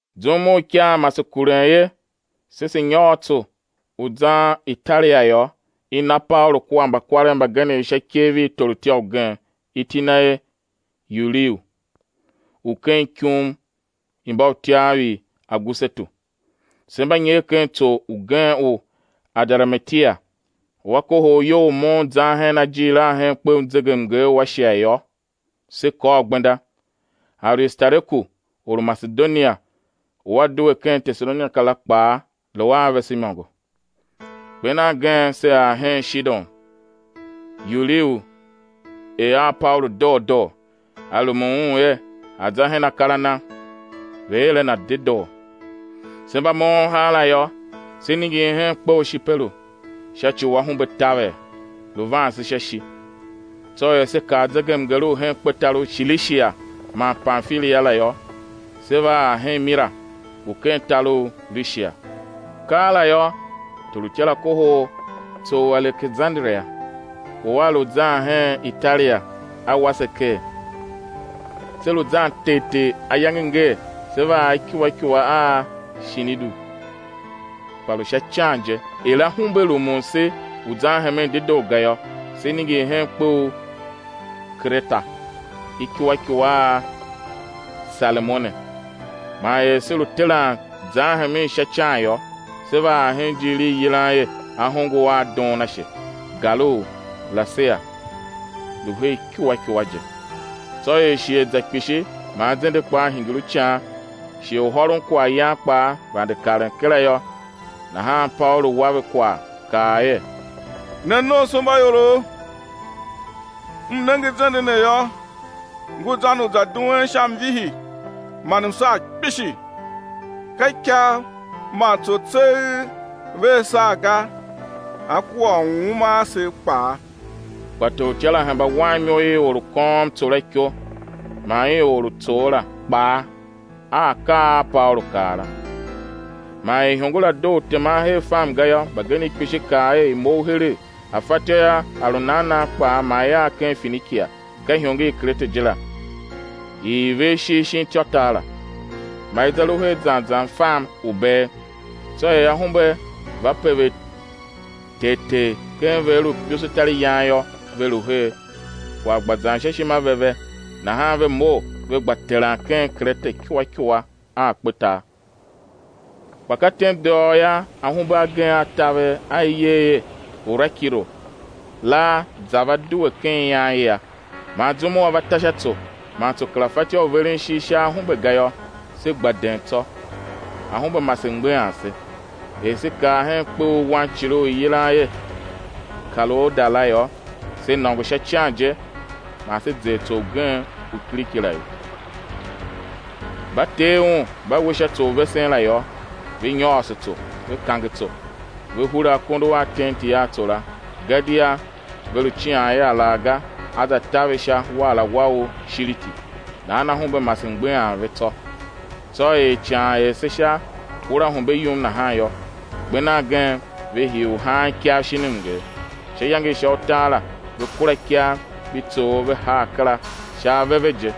Zum u ikaa mase kuren er se se̱ nyôr tso u zan Italia yô, i na Paulu kua mbakwarev mbagenev sha ikev i torutya ugen, iti na er Yuliu, u ken ikum i mbautyav i Agusetu. Se mba nyer ken tso ugen u Adaramitia, u a kohol iyol u moughon zan hen ajiir a hen kpe u zegemnger u Ashia yô, se kôr gbenda; Aristareku, or u Masedonia, u a due ken Tesalonika la kpaa lu a vese imôngo. Kper nan gen se ar hen Shidon; Yuliu er a Paulu doo doo, a rumun un er a̱ za hen akar a na, ve̱ er a na dedoo. Se mba moughon haala yô, se ningir hen kpe u Shiperu, sha ci u ahumbe taver, lu van se sha ishi. Tsô er se kar zegemnger u hen kpetar u Shilishia man Pamfilia la yô, se va ar hen Mira u ken tar u Lishia. Keela yô, torutya la kohol tso u Alekesanderia u a lu zan hen Italia; a wa se ker. Se lu zan tegh tegh ayange ngee, se va ar ikua ikua a Shinidu, kpa lu sha ican je; er ahumbe rumun se u zan hemen dedoo ga yô, se ningir hen kpe u Kerete ikua ikua a Salemone. Man er se lu teran zan hemen sha ican yô, se va ar hen ijiir i i yilan er Ahongo a Doonashe, gar u Lasea lu her ikua ikua je. Tsô er shighe za kpishi man zende kpaa hingir u ican, shighe u hôron kwaghyan kpaa vande karen kera yô, nahan Paulu wa ve kwagh, kaa a ve er: Ne nomsombaiorov, m nenge zende ne yô, ngu zan u za duen sha mvihi man msaa kpishi, ka ikav man tso tseegh vea saa ga, á kua uuma asev kpaa. Kpa torutya la hemba wan imo i or u kôôm tso la iko man i or u tsoo la kpaa a akaa a Paulu kaa la. Man er ihongo la doo u teman her fam ga yô, mbagenev kpishi kaa er, i̱ mough heregh, a fatyô yô, a lu nan nan kpaa, ma i ar ken Finikia, ka ihongo i Kerete je la, i i ver ishigh shin ityôtar la; ma i za lu her zan zan fam u̱ bee. Tsô er ahumbe va pever tegh tegh ken vegher u imbusutariyan yô, ve lu er, kwagh gba zan sha ishima ve ve, nahan ve mough ve gba teran hen Kerete ikua ikua a kpetar. Kpa ka tem dôghôô yô, ahumbe agen a taver, a i yer er, Urakilo la za va due ken ian i a. Man zum u a va ta sha tso, man tso kera fatyô u veren ishigh sha ahumbe ga yô, se gba den tsô, ahumbe mase mgbeghan se. Er se kar hen kpe u wancile u i yilan er Kalouda la yô, se nôngo sha ican je man se zer wantso ugen u kiriki la ye. Mba tee un mba we sha tso u vesen la yô, ve nyôôso tso, ve kange tso; ve hure akondo a tenti a tso la, gadia ve lu cian er alaghga á za ta ve sha waarawa u Shiriti; nahan ahumbe mase mgbeghan ve tsô. Tsô er ican er se sha uraahumbe yum nahan yô, kper nan gen ve hii u haan ikav shin mnger. Sha iyange i sha utar la, ve kura ikav mbi tsoov ve haa kera sha ave ve je.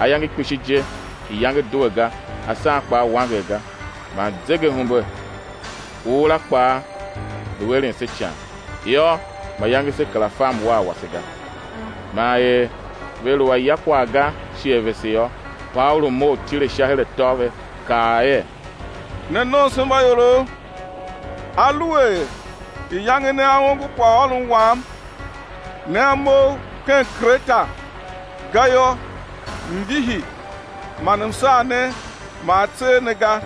Ayange kpishi je iyange due ga, asan kpaa wanger ga, man zegeahumbe u ura kpaa lu eren se ican; yô, mayange se kera fa mwar wase ga. Man er ve lu a ya kwagh ga shighe vese yum yô, Paulu mough tile sha her atô ve, kaa er: Ne nomsombaiorov, aluer iyange nea ongo kwaghôron wam nea mough ken Kerete ga yô, mvihi man msaa ne maa a tser ne ga.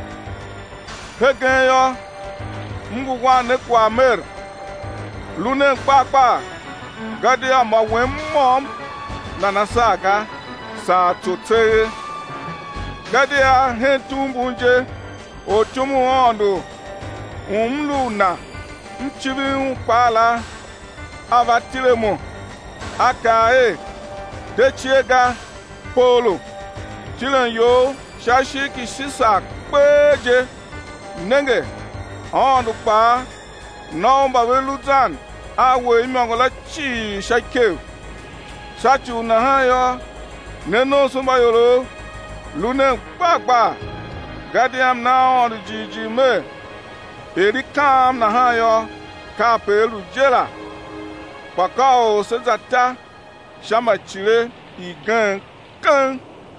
Hegen yô, m ngu wan ne kwagh mer, lu nen gbar gbar, gadia mô wen môm nana saa ga, saa tso tseegh. Gadia hen tugh mbun je ortyom u Aôndo u m lu u Na, m civir Un kpaa la, a va tile a mo. A kaa er: De cie ga, Paulu; tilen you sha ishigh ki Shisar kpee je; nenge, Aôndo kpaa na u mba ve lu zan a we imôngo la cii sha ikev. Sha ci u nahan yô, ne nomsombaiorov, lu nen gbar gbar, gadia m na Aôndo jighjigh mer, er i kaam nahan yô, kape á lu je la. Kpa ka u sé za ta sha ma icile igen keng.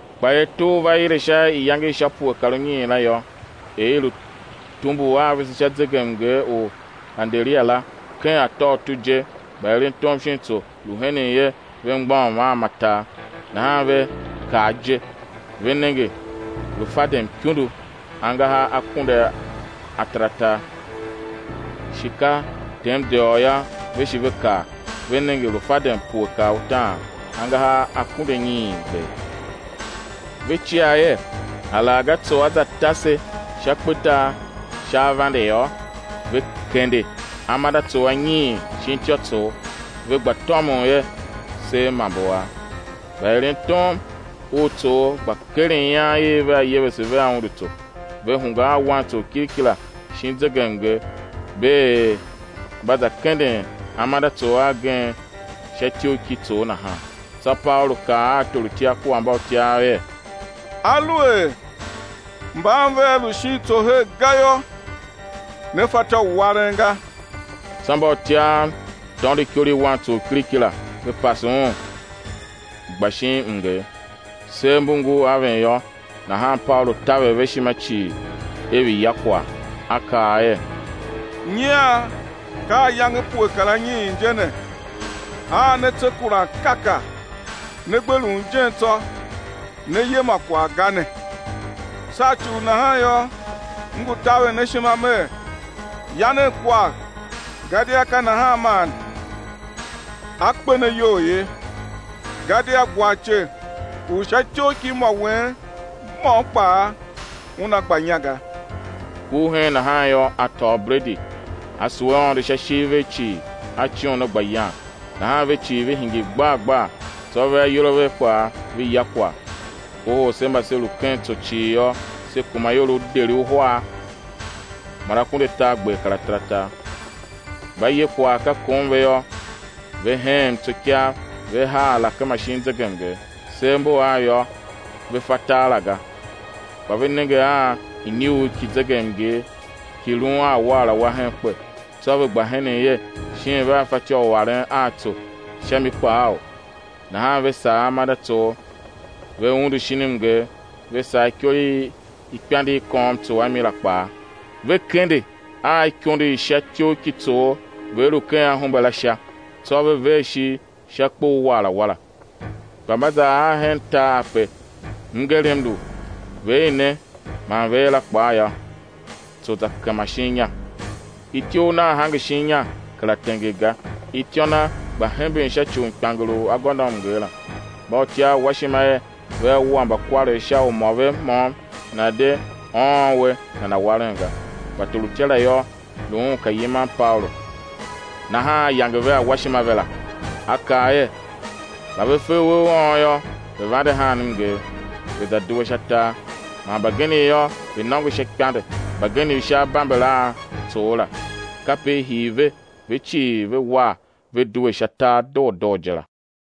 Kpa er tugh va ile sha iyange i sha pue kar unyiin la yô, er i lu tumbul a vese sha zegemnger u Aderia la, ken atôutu je mbaerentom shin tso lu henen er ve mgbôghom a ma tar nahan ve kar ije, ve nenge lu fadem ikundu; (angahar akunduataratar) shi ka tem dôghôô yô, ve shi ve kar, ve nenge lu fadem pue kar utaan (angahar akunduanyiingber). Ve cia er alaghga tso á za ta se sha kpetar sha avande yô, ve kende amandeatsoo anyiin shin ityôtsoo ve gba tômon er sev ma mbu av. Mbaerentom u tsoo gba keren ian i vea yevese vea undu tso, ve hungwa a wantso u kiriki la shin zegemnger bee er mba za kenden amandeatsoo agen sha ityough ki tsoogh nahan. Tsô Paulu kaa a torutya kua mbautyav er: Aluer mban vea lu shin tso her ga yô, né fatyô u waren ga. Tsô mbautyav tôndo ikor i wantso u kiriki la, ve pase un, gba shin mnger. Sev mbu ngur aven a av, nahan Paulu taver ve ishima cii er ve̱ ya kwagh; a kaa er: Nyian ka ayange pue kar anyiin je ne, a ne tse kuran kaka, ne gbe lun ijen tsô, ne ye ma kwagh ga ne. Sha ci u nahan yô, m ngu taver ne ishima mer, ya nen kwagh; gadia ka nahan man a kpe ne iyol ye, gadia gwarce u sha ityough ki mô wen môm kpaa una gba inya ga. Kur heen nahan yô, a tôô bredi, a sugh Aôndo sha ishigh vegh cii, a coon a gba yan. Nahan ve cii ve hingir gbar gbar, tsô ve ayol a ve kpaa ve ya kwagh. Kohol se mba se lu ken tso cii yô, se kuma ior deri uhar man akunduatargber kar ataratar. Mba ye kwagh ka kom ve yô, ve heghem tso ikav, ve haa alakema shin zegemnger. Sev mbu av yô, ve fa tar la ga, kpa ve nenge a inyuugh ki zegemnger ki lun a waarawa hen kpe; tsô ve gba henen er, shin vea fatyô u aren a tso sha mi kpaaou? Nahan ve sagh amandeatsoo, ve undu shin mnger, ve sagh ikor i ikpande i kôôm tso a mi la kpaa, ve kende a ikondo i sha ityough ki tsoogh vegher u ken ahumbe la sha, tsô ve ver ishigh sha kpe u waarawa la. Kpa mba za ar hen tar ape mngerem lu vegher ne man vegher la kpaa yô, tso za kema shin inya, ityough nagh hange shin inya, kera tenger ga; ityô na gba hemben sha ci u mkpianger u agôndoamnger la. Mbautyav wa ishima er vea wua mbakwarev sha u mô ve môm nana̱ de ôôn uwe nana̱ waren ga. Kpa torutya la yô, lu un ka yiman Paulu, nahan a yange ve awashima ve la, a kaa er, mba ve fe uwe u ôôn yô, ve̱ vande haan mnger, ve̱ za due sha tar; man mbagenev yô, ve̱ nôngo sha ikpande, mbagenev sha abamber a tsoo la; kape i hii ve ve cii ve war ve due sha tar doo doo je la.